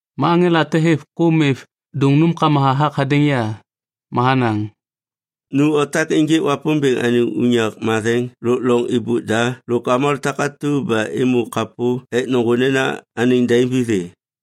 Ma aŋela te hêv kôm êv dôŋ nômkama hathak hadêŋ ya. Ma hanaŋ, “Nu otak ênjêk Wapômbêŋ anêŋ unyak matheŋ lôk loŋ êbôk da lôk avômalô takatu ba êmô kapô ek nôŋgô nena anêŋ daim vithê.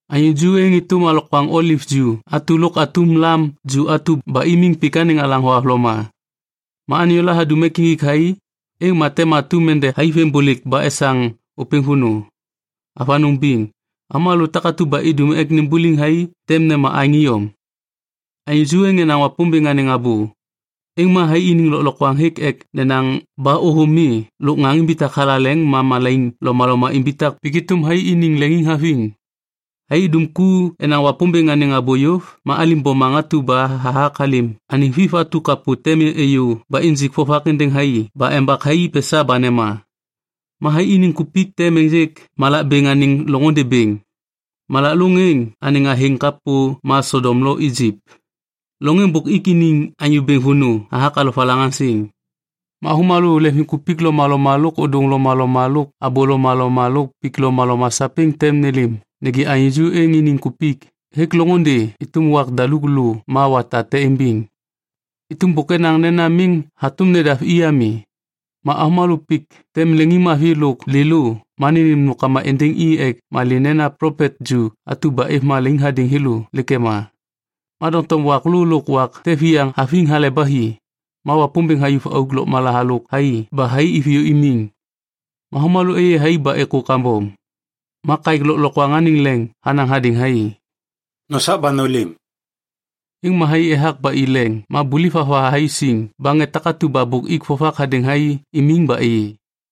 Anyô ju êŋ êtôm alokwaŋ oliv ju atu lôk atum lam ju atu ba imiŋ pik anêŋ alaŋ thohavloma. Ma anyôla hadum ek injik thai, êŋ ma tem atum ende thaiveŋiŋbôlêk ba esaŋ ôpêŋ vônô. Avanôŋ biŋ, avômalô takatu ba idum ek nimbuliŋ thai tem nema aêŋ iyom. Anyô ju êŋ enaŋ Wapômbêŋ anêŋ abô, êŋ ma thai iniŋ lôklokwaŋ hêk ek nenaŋ ba ôthôm mi lôk ŋaŋ imbitak thalaleŋ ma malaiŋ lomaloma imbitak pik êtôm thai iniŋ leŋiŋhaviŋ. Thai idum ku enaŋ Wapômbêŋ anêŋ abô yôv ma alim bomaŋ atu ba hathak halêm anêŋ Viv atu kapô tem êyô ba injik vovak êndêŋ thai ba embak thai pesa ba nema. Ma thai iniŋ kupik tem ênjêk malak bêŋ anêŋ loŋôndê bêŋ. Malak lôŋ êŋ anêŋ athêŋ kapô ma Sodom lo Ijip, loŋ êŋ bôk ik iniŋ Anyô Bêŋ vônô hathak alovalaŋaŋsiŋ. Ma avômalô leŋviŋkupik lomaloma lôk ôdôŋ lomaloma lôk abô lomaloma lôk pik lomaloma sapêŋ tem nêlêm nêgê anyô ju êŋ iniŋ kupik hêk loŋôndê êtôm wak daluk lô ma wata te imbiŋ. Êtôm bôk enaŋ nena miŋ hatôm nedav i ami. Ma avômalô pik tem leŋiŋmavi lôk lêlô ma nênêm nômkama êndêŋ i ek malê nena plopet ju atu ba êv malaiŋ hadêŋ thêlô lêk ema. Ma doŋtom wak lô lôk wak te viyaŋ haviŋ hale ba hi, ma Wapômbêŋ hayuv auk lôkmala halôk thai ba thai iviyô imiŋ. Ma avômalô êyê thai ba êkô kambom. Ma kaêk lôklokwaŋ anêŋ leŋ hanaŋ hadêŋ thai, “Nosak ba nôlêm.” Êŋ ma thai ethak ba i leŋ ma buliv hava thai siŋ ba ŋê takatu ba bôk ik vovak hadêŋ thai imiŋ ba êyê.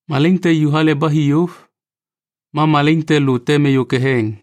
Malaiŋ te ju hale ba hi yôv. Ma malaiŋ te lô tem êyô ketheŋ.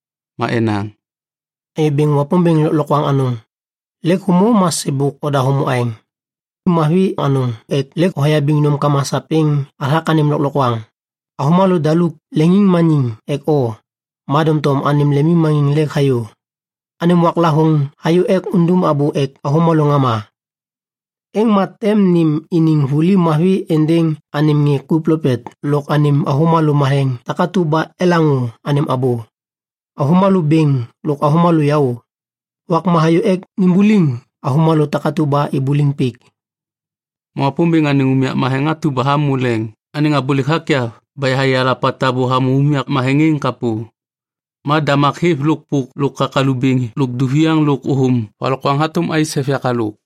Ma enaŋ, “Anyô Bêŋ Wapômbêŋ Lôklokwaŋ Anôŋ, lêk hômô ma sêbôk oda hômô aêŋ. Mavi anôŋ ek lêk hoyabiŋ nômkama sapêŋ hathak anêm lôklokwaŋ. Avômalô daluk leŋiŋmaniŋ ek o, ma doŋtom anêm lemmaniŋ lêk hayô. Anêm waklavôŋ hayô ek undum abô ek avômalô ŋama. Êŋ ma tem nêm iniŋ vuli mavi êndêŋ anêm ŋê ku plopet lôk anêm avômalô matheŋ takatu ba elaŋô anêm abô, avômalô bêŋ lôk avômalô yaô. Wakma hayô ek nimbuliŋ avômalô takatu ba ibuliŋ pik.” Ma Wapômbêŋ anêŋ unyak matheŋ atu ba hamô leŋ anêŋ abôlêk hakyav ba yahayê alapa tabô hamô unyak matheŋ êŋ kapô. Ma damak hêv lôk pôk lôk kakalu bêŋ lôk duviaŋ lôk ôthôm valokwaŋ hatôm ais hêv yak halôk.